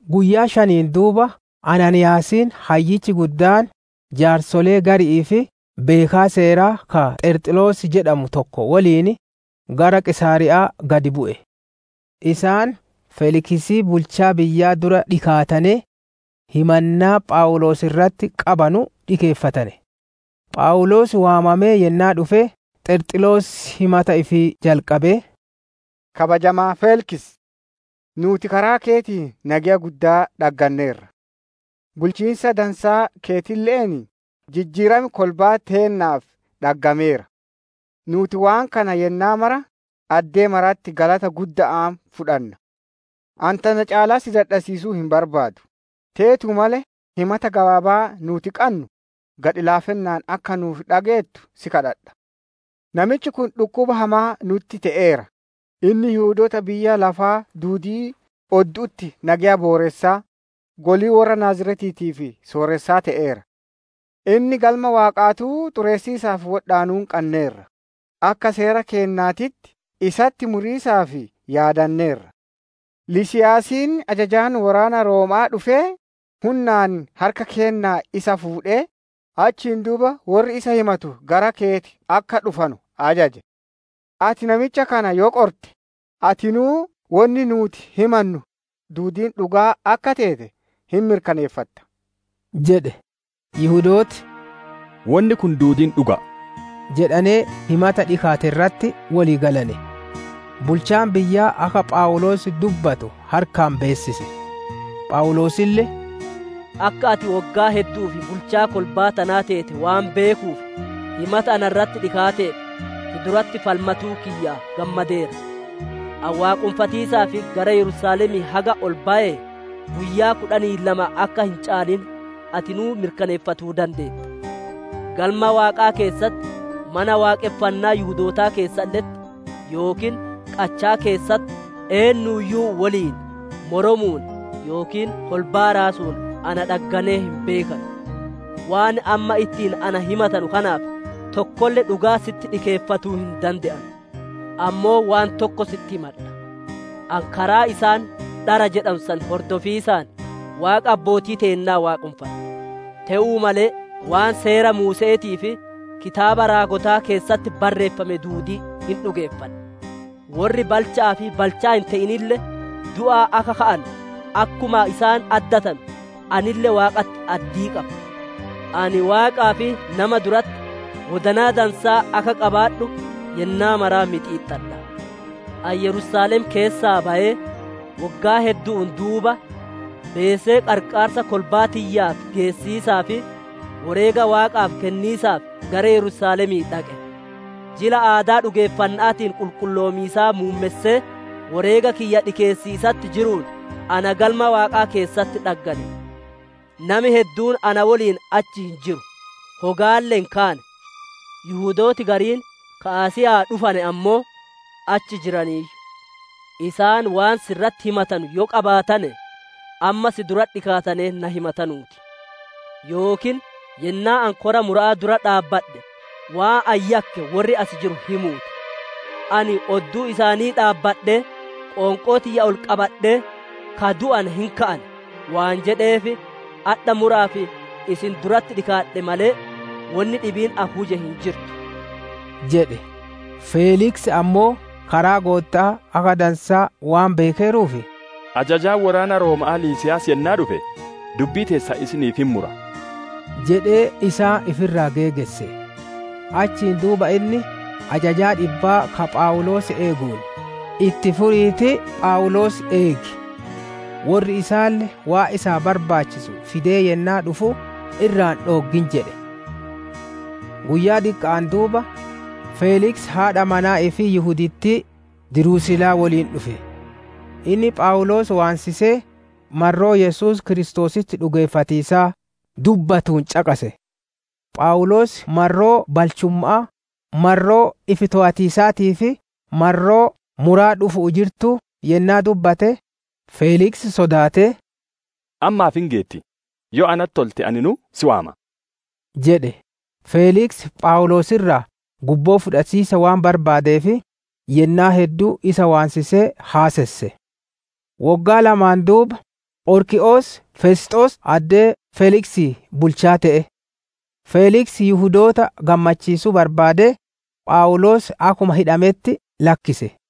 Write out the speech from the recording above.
Guyyaa shaniin duuba Anaaniiyaasiin Hayyichi Guddaan, jaarsolee gari'ii fi beekaa seeraa ka Xerxilos jedhamu tokko woliin, gara Qiisaariya'aa gad bu'e. Isaan Feeliksii bulchaa biyyaa dura dhikaatanee, himannaa Phawuloos irratti qabanu dhikeeffatane. Phawuloos waamamee yennaa dhufe, Xerxilos himata ifii jalqabee, «Kabajamaa Feeliksi! Nuuti karaa keetiin nageya guddaa dhagganneerra; bulchiinsa dansaa keetille'een, jijjiiram kolbaa teennaaf dhaggameera. Nuuti waan kana yennaa mara, addee maratti galata gudda'aan fudhanna. Ani tana caalaa si dadhassiisuu hin barbaadu; teetuu malee himata gabaabaa nuuti qannu, gadhi-laafinnaan akka nuuf dhageettu si kadhadha. Namichi kun dhukkuba hamaa nutti te'eera; inni Yihudoota biyya lafaa duudii oddu'utti nageya booressaa, golii worra Naaziretiitiif sooressaa te'eera. Inni Galma Waaqaatuu xureessiisaaf wodhaanuun qanneerra; [akka seera keennaatitti isatti muriisaaf yaadanneerra. Liisiiyaasiin ajajaan woraana Rooma'aa dhufee, hunnaan harka keennaa isa fuudhee, achiin duuba worri isa himatu gara keeti akka dhufanu ajaje.] Ati namicha kana yoo qorte, atinuu wonni nuuti himannu duudiin dhugaa akka teete hin mirkaneeffatta» jedhe. Yihudooti, «Wonni kun duudiin dhuga'a» jedhanee himata dhikaate irratti wolii galane. Bulchaan biyyaa akka Phawuloos dubbatu harkaan beessise. Phawuloosille, «Akka ati woggaa heddu'uuf bulchaa kolbaa tanaa teete waan beekuuf, himata na irratti dhikaateef, si duratti falmatuu kiyya gammadeera. Ani waaqonfatiisaaf gara Yerusaalemii haga ol bayee, guyyaa kudhanii lama akka hin caalin, atinuu mirkaneeffatuu dandeetta. Galma Waaqaa keessatti, Mana Waaqonfannaa Yihudootaa keessalle'etti yookiin qachaa keessatti eennuuyyuu woliin moromuun yookiin kolbaa raasuun na dhagganee hin beekanu. Waan amma ittiin na himatanu kanaaf, tokkolle dhugaa sitti dhikeeffatuu hin dande'anu. Ammoo waan tokko sitti himadha; ani karaa isaan, ‹Dhara› jedhanu san hordofiisaan, Waaqa abbootii teennaa waaqonfadha. Te'uu malee waan Seera Muuse'eetii fi kitaaba raagotaa keessatti barreeffame duudii hin dhugeeffadha. Worri balcha'aa fi balchaa hin te'inille du'aa akka ka'anu, akkuma isaan addatanu, anille Waaqatti addii qaba. Ani Waaqaa fi nama duratti wodanaa dansaa akka qabaadhu yennaa maraa mixiixxadha. «Ani Yerusaalem keessaa bayee, woggaa heddu'uun duuba, beesee qarqaarsa kolbaa tiyyaaf geessiisaa fi woreega Waaqaaf kenniisaaf gara Yerusaalemii dhaqe. Jila aadaa dhugeeffanna'aatiin qulqulloomiisaa muummessee, woreega kiyya dhikeessiisatti jiruun ana Galma Waaqaa keessatti dhaggane. Nami hedduun na woliin achi hin jiru; hogaalle hin kaane. Yihudooti gariin ka Asiya'aa dhufane ammoo, achi jiraniiyyu; isaan waan si irratti na himatanu adoo qabaatanee, amma si dura dhikaatanee na himatanuu ti; yookiin yennaa ani kora mura'aa dura dhaabbadhe, waan ani yakke worri as jiru himuu ti. Ani odduu isaanii dhaabbadhee, qoonqoo tiyya ol qabadhee, ‹Ka du'ane hin ka'an› waan jedheef, adha mura'aaf isin duratti dhikaadhe malee, wonni dhibiin ani huje hin jirtu» jedhe. Feeliksi ammoo karaa Gootta'aa akka dansaa waan beekeeruuf, «Ajajaan woraana Rooma'aa Liisiiyaas yennaa dhufe, dubbii teessan isiniif hin mura» jedhee isaan ifi irraa geegesse. Achiin duuba inni, ajajaa dhibbaa ka Phawuloos eeguun, «Itti furiitii Phawuloos eegi; worri isaalle waan isaaf barbaachisu fidee yennaa dhufu, irraa hin dhooggin» jedhe. Guyyaa diqqa'aan duuba, Feeliksi haadha manaa ifii Yihudittii Dirusilaa woliin dhufe. Inni Phawuloos waansisee, marroo Yesuus Kiristoositti dhugeeffatiisaa dubbatuun caqase. Phawuloos marroo balchumma'aa, marroo ifi toowatiisaatii fi marroo muraa dhufu'uu jirtuu yennaa dubbate, Feeliksi sodaatee, «Ammaaf hin geetti; yoo natti tolte aninuu si waama» jedhe. Feeliksi Phawuloos irraa gubboo fudhatiisa waan barbaadeef, yennaa hedduu isa waansisaa haasesse. Woggaan lamaan duuba, Phorkii'os Fesxoos addee Feeliksii bulchaa te'e. Feeliksi Yihudoota gammachiisuu barbaadee, Phawuloos akkuma hidhametti lakkise.